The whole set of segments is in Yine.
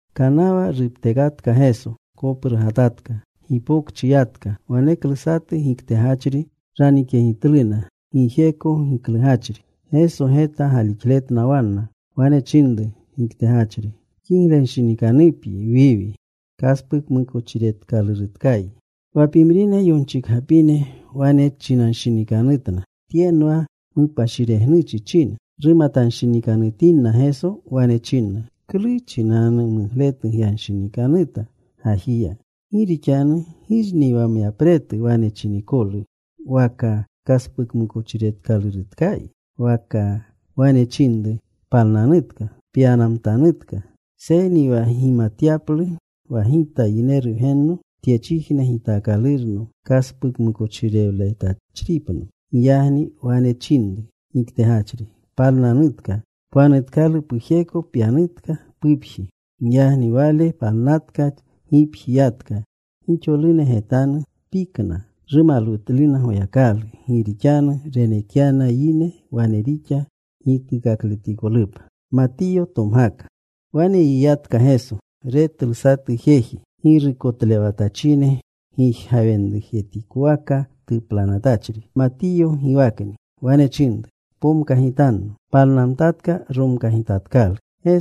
Kanawa ruptekatka Geso, koprugatatka. Gipokchi yatka. Waneklu satu giktegachri ranikyegitluna, gijeko giklugachri. Geso geta galixletna wanna. Wane chinru giktegachri, “Kiglenshinikanupyi, Wiwi. Kaspukmukochiretkalurutkayi.” Wa pimrine yonchikgapine wane chinanshinikanutna, “Tyenwa mupashiregnuchi china.” Rumatanshinikanutinna Geso, wane chinna, “¿Klu chinau mugletu gyanshinikanuta gajiya? Gi rixanu ¿girni wa myapretu wane chinikolu, waka, ‘Kaspukmukochiretkalurutkayi,’ waka wane chinru, ‘Palnanutka. Pyanamtanutka’? Seyni wa gimatyaplu wa Gita Yineru Wgenno tyechijne gitaakalurno kaspukmukochirewlewatachripno” —giyagni wane chinru giktegachri, “Palnanutka. Pwanutkalu pujeko. Pyanutka pupji.” Giyagni wale palnatka. Gipji yatka. Gixolune getanatlu. Pikna. Rumalwutluna Goyakalu, gi rixanu renekyana yine wane rixa gitakletikolupa. Wane yiyatka Geso. Retlu satu jeji, girukotlewatachine gijgawenjetikowaka tuplanatachri. Matiyo giwakni. Wane chinru, “Pomkagitanno.” Palnamtatka. Romkagitatkalu.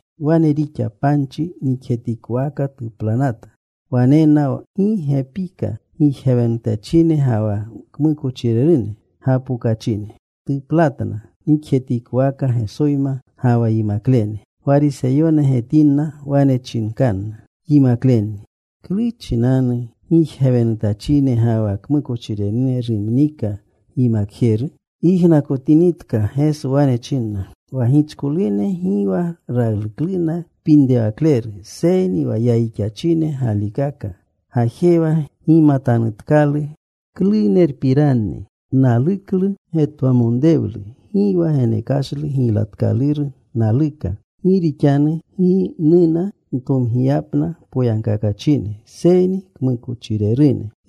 Wane rixa. Panchi nikjetikowaka tuplanata. Wanena gi gepika gijgawenutachine ga wa kmukochirerune gapokachine. Tuplatna nikjetikowaka Gesoyma ga wa yimaklene. Gwariseyone getinna. Wane chinkanna yimaklenni, “¿Klu chinanu gijgawenutachine ga wa kmukochirerune rumnika gyimakjeru?” Yijnakotinitka Geso, wane china, “Wa gichkolune gi ralukluna kpinrewakleru, seyni wa yayixachinena galikaka. Gajewa. Gimatanutkalu klunerpiranni. Naluklu getwamonrewlu. Gi wa genekashlu giylatkaluru naluka. Gi rixanu gi nuna ntomgiyapna poyagkakachine seyni kmukochirerune.”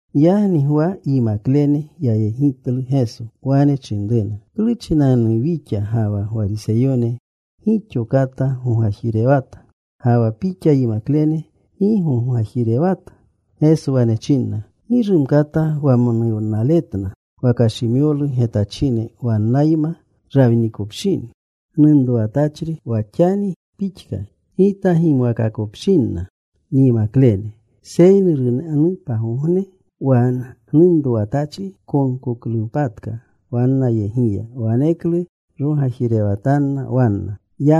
Giyagni Gwa yimaklene yayegitlu Geso. Wane chinruna, “¿Klu chinanu wixa ga wa Gwariseyone gixo kata gogajirewata; ga wa Pixa yimaklene gi gogajirewata?” Geso wane chinna, “Gi rumkata wamonuwnaletna wa kashimyolu getachine wannayma rawinikopshini gnunrowatachri, wa xani pixka Gita gimwakopshinna nyimaklene. Seyni runanu pagogne wa gnunrowatachri konkoklunpatka wannayegiya. Waneklu rogajirewatanna wanna.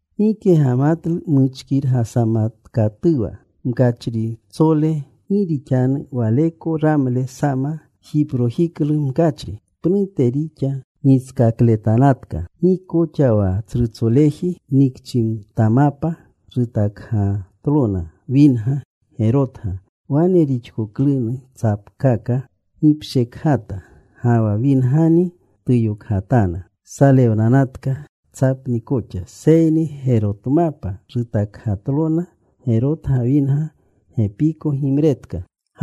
“Gike gamatlu muchkirgasamatkatuwa mkachritsole. Gi rixanu waleko ramle sama jiprojiklu mkachri. Pnute rixa giskakletanatka. Gi koxa wa tsrutsoleji nikchimtamapa rutakgatlona winga gerotga. Wane rixkoklunu tsapkaka gipshekgata. Ga wa wingani tuyokgatana. Salewnanatka tsapni koxa. Seyni gerotmapa rutakgatlona gerotga winga. Gepiko gimretka.”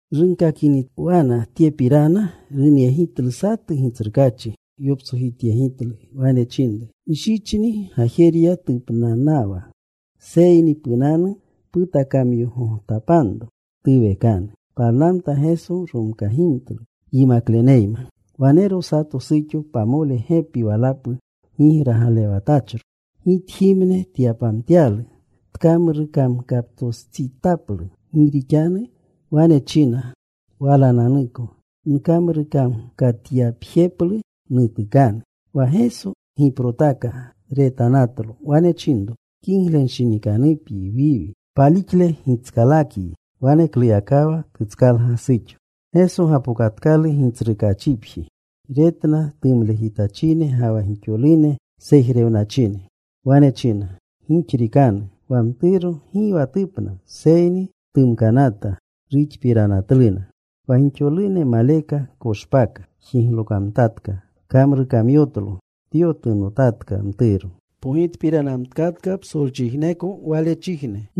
Runkakiniwana tyepirana, runyegitlu satu gitsrukaachi. Yoptsojityegitlu. Wane chinru, “Nshichni gajerya tupnanawa. Seyni punanu. Putakamyogontapanro. Tuwekanu.” Palnamta Geso. Romkagimtlu yimakleneyma. Wanero sato suxo pamole gepi walapu gigragalewatachro. Gitjimne tyapamtyalu, tkamrukamkaptostsitaplu. Gi rixanu wane china walananuko, “Nkamrukamkatyapjeplu nutukanu.” Wa Geso giprotaka. Retanatlo. Wane chinro, “Kiglenshinikanupyi, Wiwi. Palixle gitskalakyi.” Wanekluyakawa tutskalga suxo. Geso gapokatkalu gitsrukaachipji. Retna tumlejitachine ga wa gixolune sejrewnachine. Wane china, “Gixrikanu. Wa mturo gi wa tupna, seyni tumkanata.” Ruxpiranatluna. Wa gixolune maleka koshpaaka. Jiglokamtatka. Kamrukamyotlo. Tyotunotatka mturo. Pogitpiranamtkatka psolchijneko walechijne.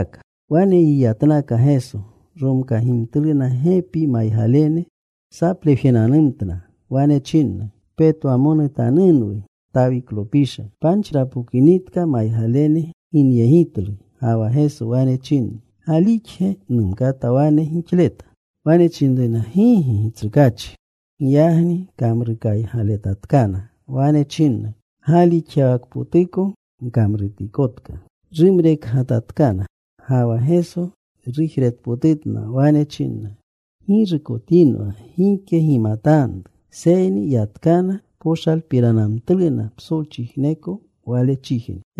Wane yiyatnaka Geso. Romkagimtluna gepi maygalene. Saplewjenanumtna. Wane chinna, “¡Petwamonutanunwu, Tawiklopisha!” Panchi rapokinitka, maygalene ginyegitlu. Ga wa Geso wane chinna, “¿Galixge numkata wane gixleta?” Wane chinruna, “Gigi, Gitsrukaachi.” Giyagni kamrukaygaletatkana. Wane chinna, “Galixyawakpotuko gkamrutikotka.” Rumrekgatatkana. Ga wa Geso rujretpotutna. Wane chinna, “Ggirukotinwa gike gimatanru.” Seyni yatkana. Poshalpiranamtluna psolchijneko walechijne.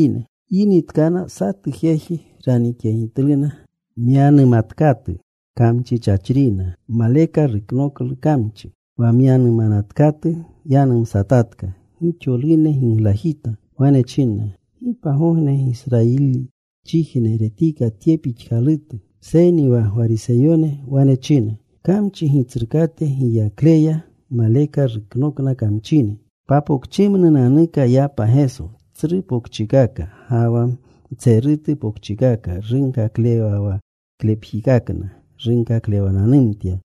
Yinitkana, satu jeji ranikyegitluna myanumatkatu, kamchichachrina. Maleka ruknoklu kamchi. Wa myanumanatkatu yanumsatatka. Gixolune giglajita. Wane chinna, “Gi pagogne Gisrayilichijne retika tye pixkalutu.” Seyni wa Gwariseyone wane china, “Kamchi gitsrukate giyakleya maleka ruknokna kamchine.” Papokchimnunanuka yapa Geso, tsru pokchikaka ga wa mtserutu pokchikaka. Runkaklewawaklepjikakna runkaklewananumtya.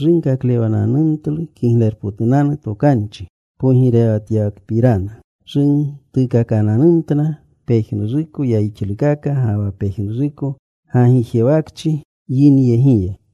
Runkakletananumtlu Kiglerupotunanu Tokanchi pogirewatyawakapirana. Rutuukakananumtlu pejnuruko yayixlukaka, ga wa pejnuruko gagijewakchi yinyegiya.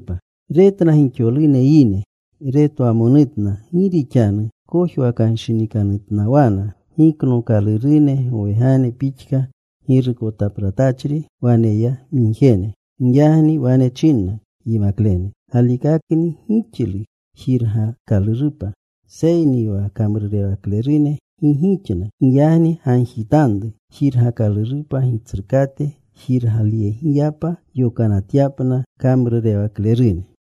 Retna gixolune yine. Retwamonutna, gi rixanu kojwakanshinikanutnawana. Giknookalurune gowegane pixka, girukotapratachri waneyamigjene. Giyagni wane chinna yimaklene, “Galikakni gixlu jirgakalurupa. Seyni wa kamrurewaklerune gi gixna. Giyagni gagjitanru jirgakalurupa Gitsrukate jirgalyegipa yokanatyapna kamrurewaklerune.”